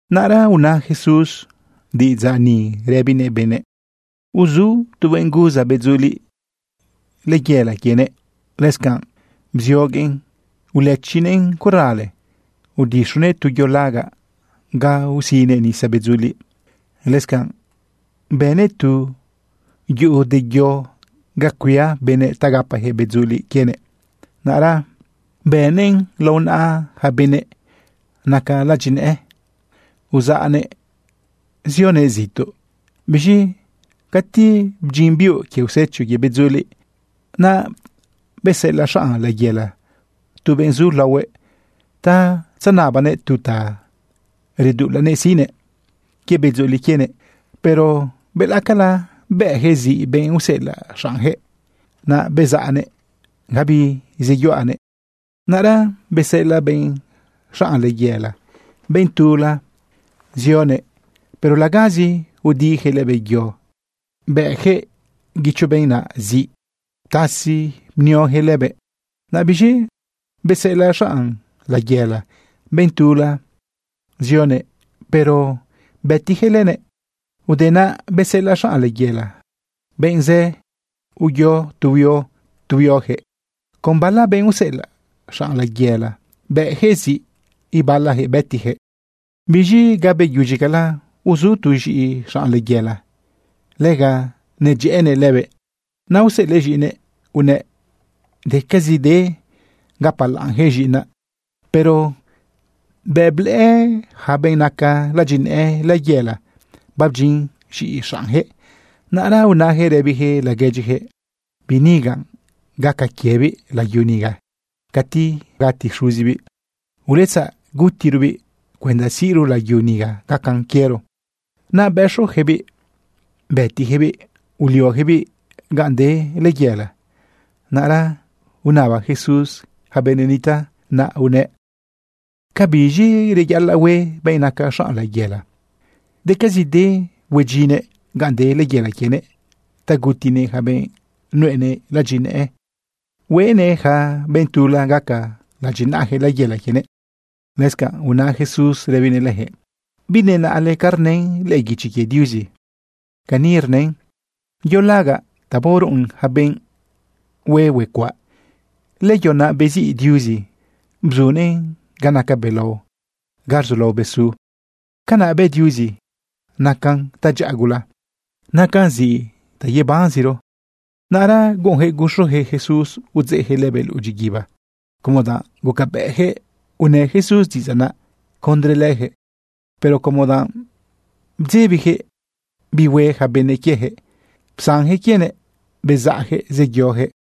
Naꞌra una Jesús diꞌidzaꞌ ni rëbinëꞌ benëꞌ: ―Uzu tu benꞌ guza bedzuliꞌ layela quienëꞌ. Lëscanꞌ psioguëꞌn ulëchinëꞌn corale, udixunëꞌ tu yo lagaꞌ ga usinëꞌ nisa bedzuliꞌ. Lëscanꞌ bënëꞌ tu yuꞌu de yo ga cuia benëꞌ ta gapayaquëꞌ bedzuliꞌ quienëꞌ. ’Naꞌra bëꞌnëꞌn lao naꞌa yaca benëꞌ naca ladyinëꞌë, uzaꞌnëꞌ zioguëꞌ zituꞌ. Biz̃i cati bdyin biuꞌ quie usecho quie bedzuliꞌ, naꞌ beseꞌelaꞌ xanꞌ layela tu benꞌ zu laohuëꞌ ta tzenabanëꞌ tu ta reduꞌulanëꞌ siꞌnëꞌ quie bedzuliꞌ quienëꞌ. Pero belaꞌcala bëꞌyaquëꞌ ziꞌ benꞌ useꞌelaꞌ xaꞌnyaquëꞌ. Naꞌ bezaꞌnëꞌ gabi zeyuꞌanëꞌ. Naꞌra beseꞌelaꞌ benꞌ xanꞌ layela benꞌ tula zioguëꞌ. Pero lagazi udiyaquëꞌ lëbëꞌ yo, bëꞌyaquëꞌ guicho benꞌ naꞌ ziꞌ, ptasi bnioyaquëꞌ lëbëꞌ. Naꞌ biz̃i beseꞌelaꞌ xanꞌ layela benꞌ tula zioguëꞌ, pero bëtiyaquëꞌ lënëꞌ. Te naꞌ beseꞌelaꞌ xanꞌ layela benꞌ zë, uyo tu huio tu huioyaquëꞌ. Con bala benꞌ useꞌelaꞌ xanꞌ layela bëꞌyaquëꞌ ziꞌ, ibalayaquëꞌ bëtiyaquëꞌ. ’Biz̃i ga beyudyicala uzu tu z̃iꞌi xanꞌ layela, lega nedyëꞌënëꞌ lëbëꞌ. Naꞌ useꞌelëꞌ z̃iꞌinëꞌ unëꞌ: “Decazide gapalaꞌnyaquëꞌ z̃iꞌinaꞌ.” Pero bëꞌ blëꞌë yaca benꞌ naca ladyinëꞌë layela babdyin z̃iꞌi xaꞌnyaquëꞌ, naꞌra unayaquëꞌ rëbiyaquëꞌ laguedyiyaquëꞌ: “Biꞌ niga, gaca quiebiꞌ layu niga cati bagati xuzibiꞌ. Uletzaꞌ gutirobiꞌ cuenda siꞌro layu niga gacan quiero.” Naꞌ bëxoyaquëꞌbiꞌ bëtiyaquëꞌbiꞌ, ulioyaquëꞌbiꞌ ganꞌ de layela. Naꞌra unaba Jesús yaca benëꞌ nitaꞌ naꞌ unëꞌ: ―¿Cabiz̃i reyaꞌalaꞌ hue benꞌ naca xanꞌ layela? Decazide huedyinnëꞌ ganꞌ de layela quienëꞌ ta gutinëꞌ yaca benꞌ nuꞌenëꞌ ladyinëꞌë, hueꞌnëꞌ yaca benꞌ tula gaca ladyinaꞌayaquëꞌ layela quienëꞌ. Lëscanꞌ una Jesús rëbinëꞌ leyaquëꞌ: ―¿Binenaꞌle ca rnën lëꞌë guichi quie Diuzi? Cani rnën: Yo lagaꞌ ta baoruꞌun yaca benꞌ hue huecuaꞌ, lëyo naꞌ besiꞌ Diuzi bzunëꞌn ga naca belao, ga rzulao bezu. Canaꞌ bë Diuzi. Nacan tadyaꞌa gula. Nacan ziꞌ ta yebanziro. Naꞌra guꞌunyaquëꞌ guxuyaquëꞌ Jesús udzeꞌyaquëꞌ lëbëꞌ luꞌu dyiguiba como danꞌ gucabëꞌyaquëꞌ unë Jesús diꞌidzaꞌ naꞌ condre leyaquëꞌ. Pero como danꞌ bdzebiyaquëꞌ bi hue yaca benëꞌ quieyaquëꞌ, psanyaquëꞌ quienëꞌ, bezaꞌyaquëꞌ zeyoyaquëꞌ.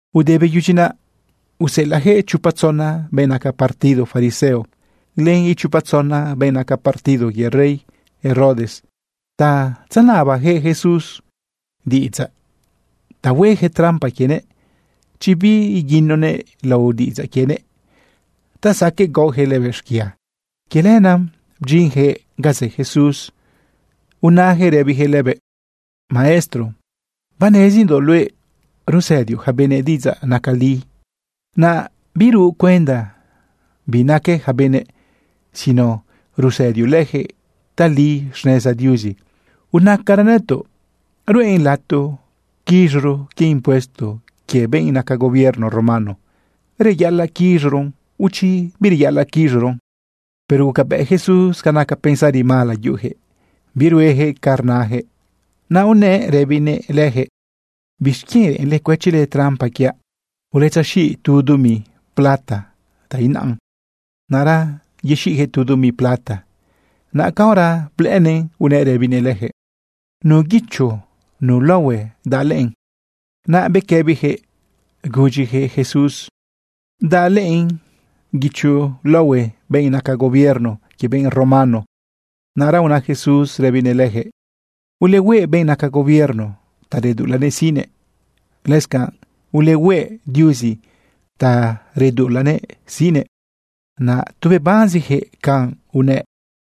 Ude beyudyi naꞌ, useꞌelaꞌyaquëꞌ chopa tzona benꞌ naca partido fariseo len ichopa tzona benꞌ naca partido quie rey Herodes ta tzenabayaquëꞌ Jesús diꞌidzaꞌ ta hueyaquëꞌ trampa quienëꞌ chi biguinonëꞌ lao diꞌidzaꞌ quienëꞌ ta saqueꞌ gaoyaquëꞌ lëbëꞌ xquia. Quie lenaꞌ bdyinyaquëꞌ ganꞌ zë Jesús unayaquëꞌ rëbiyaquëꞌ lëbëꞌ: ―Maestro, banezindoꞌ luëꞌ rusëdioꞌ yaca benëꞌ diꞌidzaꞌ naca li. Naꞌ biruꞌ cuenda bi naque yaca benëꞌ sino rusëdioꞌ leyaquëꞌ tali xneza Diuzi. Unacara nëtoꞌ: ¿Ruꞌen lato quiz̃oro quie impuesto quie benꞌ naca gobierno romano? ¿Reyaꞌalaꞌ quiz̃oron o chi bireyaꞌalaꞌ quiz̃oron? Pero gucabëꞌ Jesús ca naca pensari mala yuꞌuyaquëꞌ birueyaquëꞌ ca rnayaquëꞌ. Naꞌ unëꞌ rëbinëꞌ leyaquëꞌ: ―¿Bixquienꞌ reꞌenle cuëchile trampa quiaꞌ? Uletzexiꞌ tu dumi plata ta inaꞌa. Naꞌra yexiꞌyaquëꞌ tu dumi plata. Naꞌ caora blëꞌënëꞌn, unëꞌ rëbinëꞌ leyaquëꞌ: ―¿Nu guicho, nu laohue daꞌ lëꞌën? Naꞌ bequëbiyaquëꞌ unayaquëꞌ Jesús: ―Daꞌ lëꞌën guicho laohue benꞌ naca gobierno quie benꞌ romano. Naꞌra una Jesús rëbinëꞌ leyaquëꞌ: ―Ulehueꞌ benꞌ naca gobierno ta reduꞌulanëꞌ siꞌnëꞌ. Lëscanꞌ ulehueꞌ Diuzi ta reduꞌulanëꞌ siꞌnëꞌ. Naꞌ tu bebanziyaquëꞌ canꞌ unëꞌ.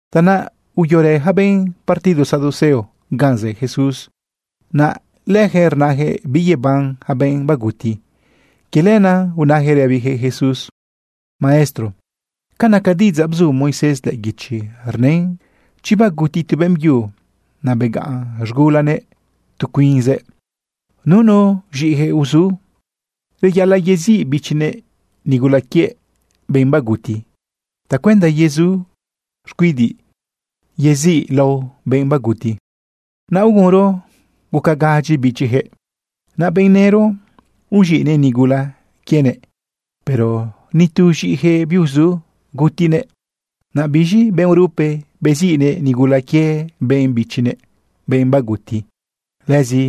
Tanaꞌ uyorë yaca benꞌ partido Saduceo ganꞌ zë Jesús. Naꞌ leyaquëꞌ rnayaquëꞌ biyeban yaca benꞌ baguti. Quie lenaꞌ unayaquëꞌ rëbiyaquëꞌ Jesús: ―Maestro, ca naca diꞌidzaꞌ bzu Moisés lëꞌë guichi, rnën chi baguti tu beꞌmbyu, naꞌ begaꞌn z̃gulanëꞌ tu cuinzëꞌ, nunu z̃iꞌiyaquëꞌ uzu, reyaꞌalaꞌ yeziꞌ bichinëꞌ nigula quie benꞌ baguti tacuenda yezu xcuidiꞌ yeziꞌ lao benꞌ baguti. Naꞌ ugunro guca gadyi bichiyaquëꞌ. Naꞌ benꞌ nëro uz̃iꞌnëꞌ nigula quienëꞌ. Pero ni tu z̃iꞌiyaquëꞌ biuzu gutinëꞌ. Naꞌ biz̃i benꞌ urupe beziꞌnëꞌ nigula quie benꞌ bichinëꞌ, benꞌ baguti. Lëzi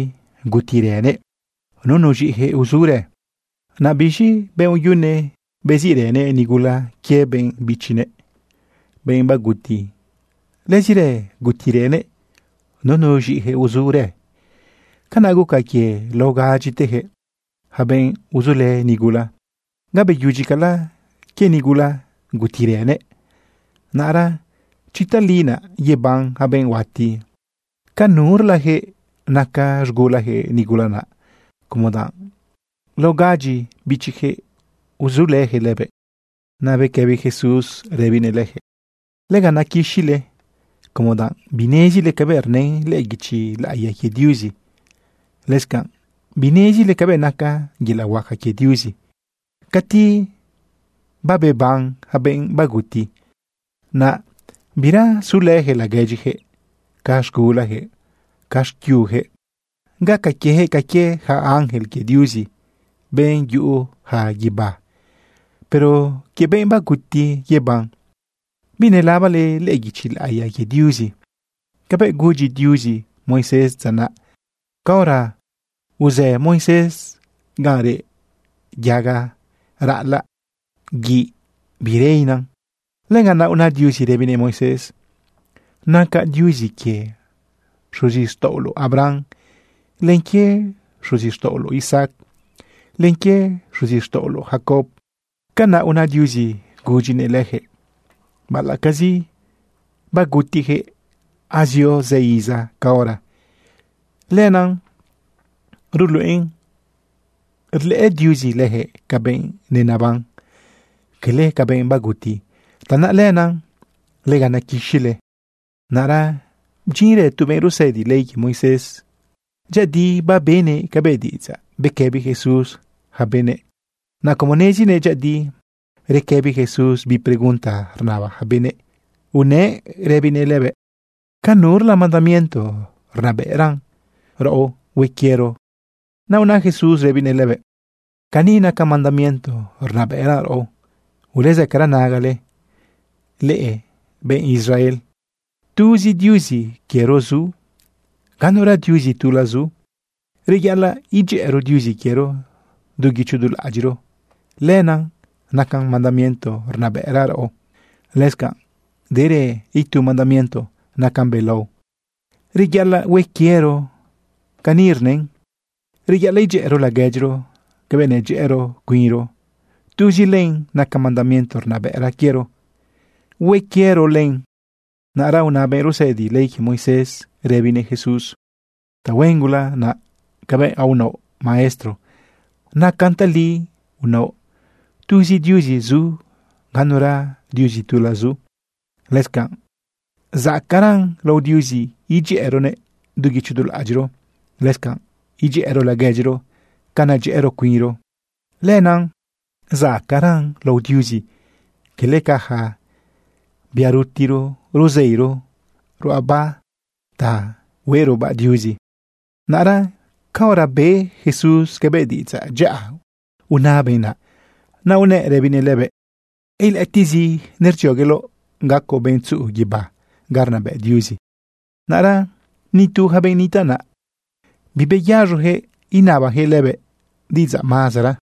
gutirënëꞌ, nunu z̃iꞌiyaquëꞌ uzurë. Naꞌ biz̃i benꞌ uyune beziꞌrënëꞌ nigula quie benꞌ bichinëꞌ, benꞌ baguti. Lëzirë gutirënëꞌ nunu z̃iꞌiyaquëꞌ uzurë. Canaꞌ guca quie lao gadyiteyaquëꞌ, yaca benꞌ uzulë nigula. Gabeyudyicala quie nigula gutirënëꞌ. Naꞌra chi tali naꞌ yeban yaca benꞌ huati, ¿ca nurlayaquëꞌ naca z̃gulayaquëꞌ nigula naꞌ, como danꞌ lao gadyi bichiyaquëꞌ uzulëyaquëꞌ lëbëꞌ? Naꞌ bequëbi Jesús rëbinëꞌ leyaquëꞌ: ―Lega nequixile como danꞌ binezile cabëꞌ rnën lëꞌë guichi laꞌiya quie Diuzi. Lëscanꞌ binezile cabëꞌ naca yelaꞌ huaca quie Diuzi. Cati babeban yaca benꞌ baguti, naꞌ bira sulëyaquëꞌ laguedyiyaquëꞌ ca z̃gulayaquëꞌ, ca xquiuyaquëꞌ. Gaca quieyaquëꞌ ca quie yaca ángel quie Diuzi, benꞌ yuꞌuyaca guibá. Pero quie benꞌ baguti yeban, ¿binelabale lëꞌë guichi laꞌiya quie Diuzi cabëꞌ gudyi Diuzi Moisés dza naꞌ caora uzë Moisés ganꞌ reꞌ yaga raꞌalaꞌ guiꞌ birena? Lëganꞌ naꞌ una Diuzi rëbinëꞌ Moisés: “Nacaꞌ Diuzi quie xuzixtaꞌoloꞌ Abraham, len quie xuzixtaꞌoloꞌ Isaac, len quie xuzixtaꞌoloꞌ Jacob.” Canaꞌ una Diuzi gudyinëꞌ leyaquëꞌ, baꞌalaꞌcazi bagutiyaquëꞌ azio zë iza caora. Lenaꞌ ruluꞌen rlëꞌë Diuzi leyaquëꞌ ca benꞌ neneban, quele ca benꞌ baguti. Tanaꞌ lenaꞌ lega nequixile. Naꞌra bdyinrë tu benꞌ rusëdi ley quie Moisés. Dyëꞌëdi babenëꞌ cabëꞌ diꞌidzaꞌ bequëbi Jesús yaca benëꞌ. Naꞌ como nezinëꞌ dyëꞌëdi requëbi Jesús bi pregunta rnaba yaca benëꞌ, unëꞌ rëbinëꞌ lëbëꞌ: ―¿Ca nurla mandamiento rnabëꞌran raꞌo hue quiero len? Naꞌ una Jesús rëbinëꞌ lëbëꞌ: ―Cani naca mandamiento rnabëꞌran raꞌo: “Ulezëcara nagale, leꞌe benꞌ Israel. Tuzi Diuzi quiero zu, ganura Diuzi tula zu. Reyaꞌalaꞌ idyëꞌëro Diuzi quiero du guicho du laꞌadyiꞌro.” Lenaꞌ naca mandamiento rnabëꞌran raꞌo. Lëscanꞌ derë itu mandamiento nacan belao reyaꞌalaꞌ hue quiero. Cani rnën: “Reyaꞌalaꞌ idyëꞌëro laguedyiro cabëꞌ nedyëꞌëro cuinro.” Tuzi len naca mandamiento rnabëꞌra quiero, hue quiero len. Naꞌra una benꞌ rusëdi ley quie Moisés rëbinëꞌ Jesús: ―Tahuen gula naꞌ cabëꞌ unaoꞌ, Maestro. Nacan tali unaoꞌ tuzi Diuzi zu, ganura Diuzi tula zu. Lëscanꞌ zacaꞌran lao Diuzi idyëꞌëronëꞌ du guicho du laꞌadyiꞌro, lëscanꞌ idyëꞌëro laguedyiro ca nedyëꞌëro cuinro. Lenaꞌ zacaꞌran lao Diuzi quele ca yaca bia rutiro ruzeiro ruꞌaba ta hueꞌrobaꞌ Diuzi. Naꞌra caora be Jesús cabëꞌ diꞌidzaꞌ dyaꞌa una benꞌ naꞌ, naꞌ unëꞌ rëbinëꞌ lëbëꞌ: ―Ilëꞌëtiꞌzi nerdziogueloꞌ gacoꞌ benꞌ tzuꞌu guibá ga rnabëꞌ Diuzi. Naꞌra nitu yaca benꞌ nitaꞌ naꞌ beyaz̃oyaquëꞌ inabayaquëꞌ lëbëꞌ diꞌidzaꞌ mazara.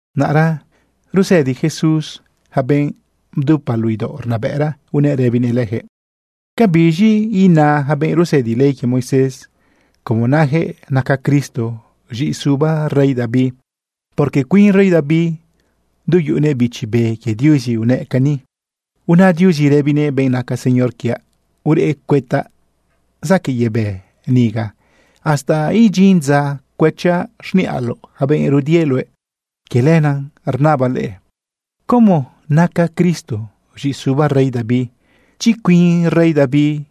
Naꞌra rusëdi Jesús yaca benꞌ bdupa luꞌu idaoꞌ rnabëꞌra, unëꞌ rëbinëꞌ leyaquëꞌ: ―¿Ca biz̃i ina yaca benꞌ rusëdi ley quie Moisés, como nayaquëꞌ naca Cristo z̃iꞌisuba rey David? Porque cuin rey David, du yuꞌunëꞌ Bichi Be quie Diuzi, unëꞌ cani: Una Diuzi rëbinëꞌ benꞌ naca Señor quiaꞌ: “Ureꞌ cuëtaꞌ zaquëꞌ yebë niga hasta idyin dza cuëchaꞌ xniꞌaloꞌ yaca benꞌ rudie luëꞌ.” Quie lenaꞌ rnabaꞌ leꞌe, ¿cómo naca Cristo z̃iꞌisuba rey David, chi cuin rey David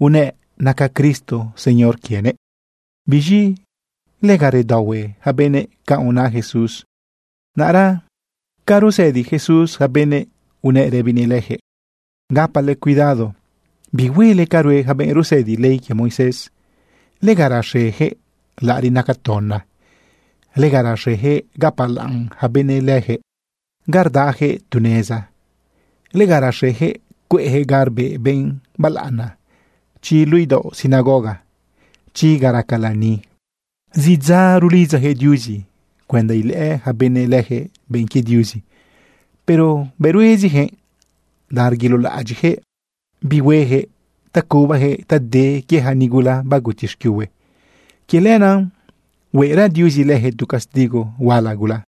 unëꞌ naca Cristo Señor quienëꞌ? Biz̃i lega redaohue yaca benëꞌ canꞌ una Jesús. Naꞌra ca rusëdi Jesús yaca benëꞌ, unëꞌ rëbinëꞌ leyaquëꞌ: ―Gapale cuidado bihuele ca rue yaca benꞌ rusëdi ley quie Moisés. Lega rexeyaquëꞌ laꞌariꞌ naca tona. Lega rexeyaquëꞌ gapalaꞌn yaca benëꞌ leyaquëꞌ ga rdayaquëꞌ tu neza. Lega rexeyaquëꞌ cueꞌyaquëꞌ ga rbeꞌ benꞌ balaꞌana chi luꞌu idaoꞌ sinagoga, chi ga raca lani. Zidza rulidzayaquëꞌ Diuzi cuenda ilëꞌë yaca benëꞌ leyaquëꞌ benꞌ quie Diuzi, pero bëꞌ rueziyaquëꞌ danꞌ reguilolaꞌadyiꞌyaquëꞌ bi hueyaquëꞌ ta cubayaquëꞌ ta de quie yaca nigula baguti xquiuhue. Quie lenaꞌ huera Diuzi leyaquëꞌ tu castigo huala gula.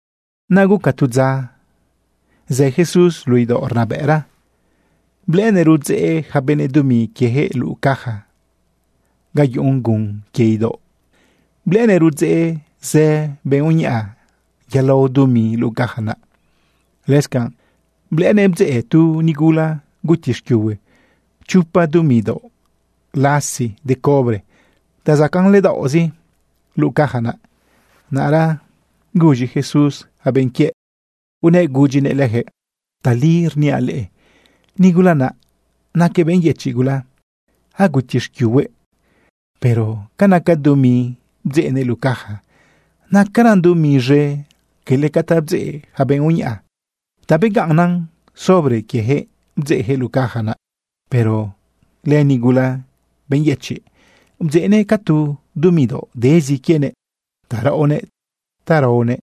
Naꞌ guca tu dza zë Jesús luꞌu idaoꞌ rnabëꞌra blëꞌënëꞌ rudzeꞌ yaca benëꞌ dumi quieyaquëꞌ luꞌu caja ga yuꞌun gun quie idaoꞌ. Blëꞌënëꞌ rudzeꞌ zë benꞌ uñaꞌa yalao dumi luꞌu caja naꞌ. Lëscanꞌ blëꞌënëꞌ bdzeꞌ tu nigula guti xquiuhue chopa dumi daoꞌ lasi de cobre ta zacaꞌn ledaoꞌzi luꞌu caja naꞌ. Naꞌra guz̃i Jesús yaca benꞌ quiëꞌ, unëꞌ gudyinëꞌ leyaquëꞌ: ―Tali rniaꞌ leꞌe, nigula naꞌ naquëꞌ benꞌ yëchiꞌ gula, aguti xquiuhuëꞌ, pero ca naca dumi bdzeꞌnëꞌ luꞌu caja, nacaran dumi z̃e quele ca ta bdzeꞌ yaca benꞌ uñaꞌa. Ta begaꞌnnan sobre quieyaquëꞌ bdzeꞌyaquëꞌ luꞌu caja naꞌ. Pero lënigula benꞌ yëchiꞌ, bdzeꞌnëꞌ ca tu dumi daoꞌ dezi quienëꞌ ta raꞌonëꞌ ta raonëꞌ.